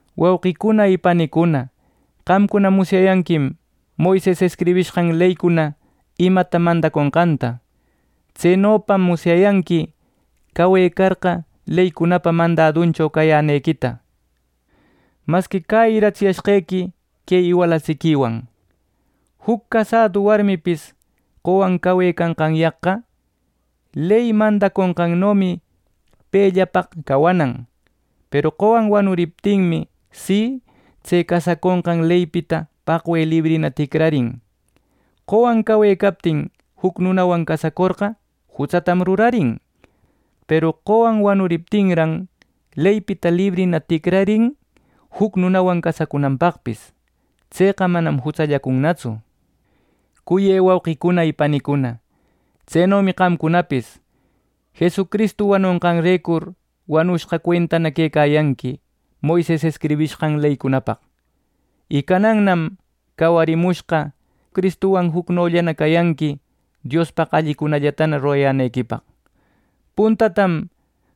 Wauqicuna y panicuna, qamcuna musyayanquim Moises escribishqan leycuna imata mandaconqanta. Tsenopam musyayanqui cawecarqa, leycunapa mandaduncho cayanqequita. Masqui cäyiratsiyashqequi que iwalatsiquiwan. Juc casadu warmipis qowan cawecanqanyaqqa ley mandaconqannomi pellawan cawanan. Peru qowan wanuriptinmi, si tse casaconqan leypita paqwe librina ticrarin. Qowan cawecaptin juc nunawan cacurcorqa, jutsatam rurarin. Peru qowan wanuriptinran, leypita librina ticrarin juc nunawan casacunanpaqpis. Tseqa manam jutsallacunnatsu. Cuyë wauqïcuna y panicuna, tsenomi qamcunapis Jesucristu wanushqanrecur wanushqa cuentana quecayanqui Moises escribishqan leycunapaq. Y canannam cawarimushqa Cristuwan jucnollana cayanqui Diospaq allicunallatana rurayänequipaq. Puntatam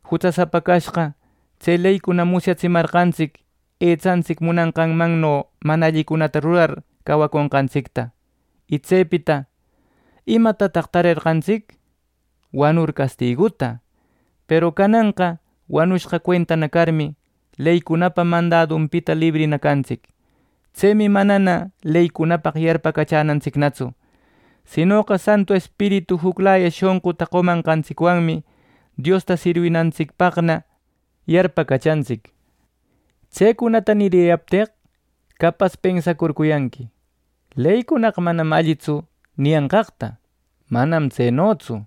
jutsasapa cashqa, tse leycuna musyatsimarqantsic etsantsic munanqanmanno mana allicunata rurar cawaconqantsicta. Y tsepita ¿imatataq tarerqantsic: wanucur castiguta! Peru cananqa wanushqa cuentana carmi, leycunapa mandadunpita librina cantsic. Tsemi manana leycunapaq yarpacachänantsicnatsu; sinoqa Santu Espiritu juclaya shonquta qomanqantsicwanmi Diosta sirwinantsicllapaqna yarpacachantsic. Tsecunata niriyapteq capas pensacurcuyanqui “leycunaqa manam allitsu” niyanqaqta. ¡Manam tsenotsu!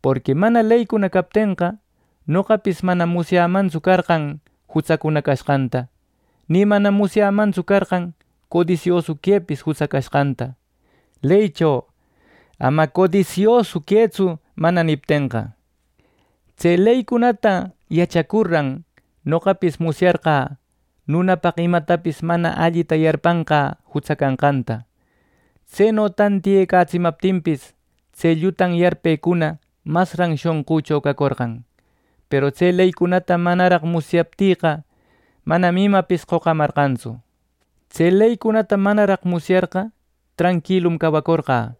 Porqui mana leycuna captenqa, noqapis manam musyämantsu carqan jutsacuna cashqanta. Ni manam musyämantsu carqan codisiosu quepis jutsa canqanta, leycho “Ama codisiosu quëtsu” mana niptenqa. Tse leycunata yachacurran noqapis musyarqä nunapaq imatapis mana allita yarpanqä jutsa canqanta. Tseno tantiyecatsimaptinpis tse llutan yarpecuna masran shonqücho cacorqan. Peru tse leycunata manaraq musyaptïqa manam imapis qocamarqantsu. Tse leycunata manaraq musyarqa tranquilum cawacorqä.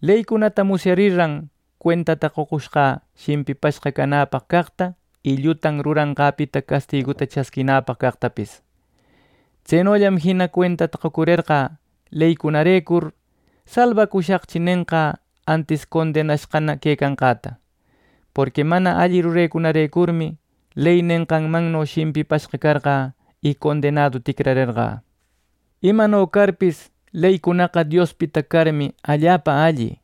Leycunata musyarirran cuentata qocushqä shimpipashqa canäpaq caqta y llutan ruranqäpita castiguta chasquinäpaq caqtapis. Tsenollam jina cuentata qocurerqä leycunarecur “salbacushaqchi” nenqä antis condenashqana quecanqäta. Porqui mana alli rurecunärecurmi ley nenqanmanno shimpipashqa carqä y condenadu ticrarerqä. Imano carpis, leycunaqa Diospita carmi allapa alli.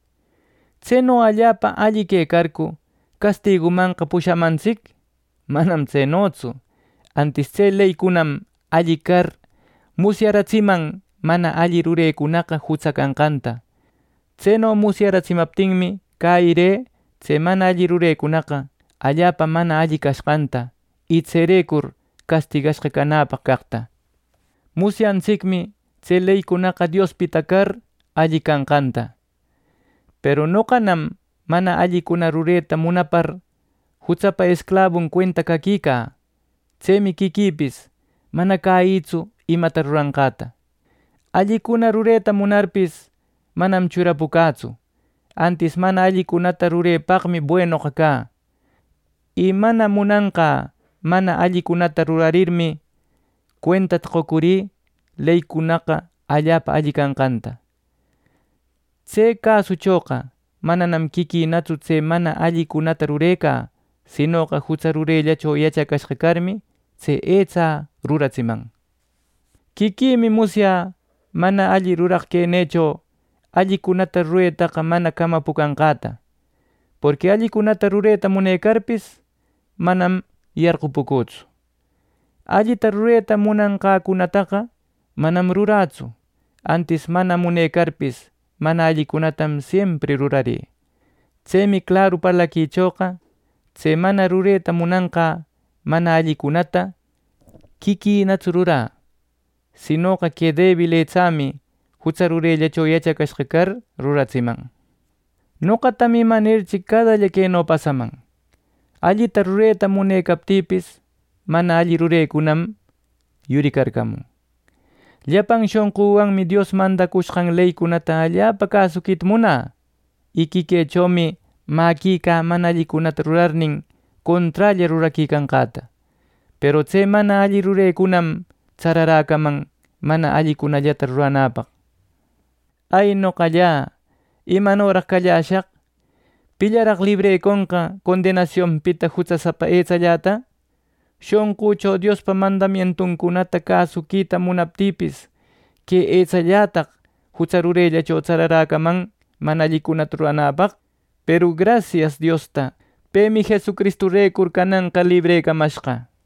¿Tseno allapa alli quecarcu castigumanqa pushamantsic! ¡Manam tsenotsu! Antis tse leycunam alli car musyaratsiman mana alli rurecunaqa jutsa canqanta. Tseno musyatsimaptinmi, cäyirï tse mana alli rurecunaqa allapa mana alli cashqanta, y tserecur castigashqa canäpaq caqta. Musyantsicmi tse leycunaqa Diospita car alli cashqanta. Peru noqanam mana allicuna rureta munapar jutsapa esclabun cuenta caquicä. Tsemi quiquïpis mana cäyïtsu imata ruranqata. Allicuna rureta munarpis, manam churapucätsu; antis mana allicunata rurepaqmi buenoqa cä. Y mana munanqä mana allicunata rurarirninmi, cuentata qocurï leycunaqa allapa alli cashqanta. Tse cäsuchoqa mananam quiquïnatsu tse mana allicunata rurecä; sinoqa jutsa rurellacho yachacashqa carmi, que etsä ruratsiman. Quiquïmi musyä mana alli ruraq quenïcho allicunata ruretaqa mana camapucanqäta. Porqui allicunata rureta munecarpis, manam yarqupucütsu. Allita rureta munanqäcunataqa manam rurätsu. Antis mana munecarpis, mana allicunatam siempri rurarï. Tsemi claru parlaquichoqa tse mana rureta munanqä mana allicunata quiquïnatsu rurä. Sinoqa que debil etsämi jutsa rurellacho yachacashqa car ruratsiman. Noqatam imanirchi cadalla queno pasaman: Allita rureta munecaptïpis, mana alli rurenïcunam yurircamun. Llapan shonqüwanmi Dios mandacushqan leycunata allapa cäsuquita munä. Y quiquïchomi mäquicä mana allicunata rurarnin, conträlla ruraquicanqäta. Peru tse mana alli rurenïcunam tsararäcaman mana allicunallata ruranäpaq. ¡Ay, noqalla! ¿Imanoraq calläshaq! ¿Pillaraq libreconqa condenasionpita jutsasapa etsalläta! Shonqücho Diospa mandamientuncunata cäsuquita munaptïpis, que etsallätaq jutsa rurellacho tsararäcaman mana allicunata ruranäpaq. Peru ¡grasias Diosta! ¡Pemi Jesucristurecur cananqa librecamashqa!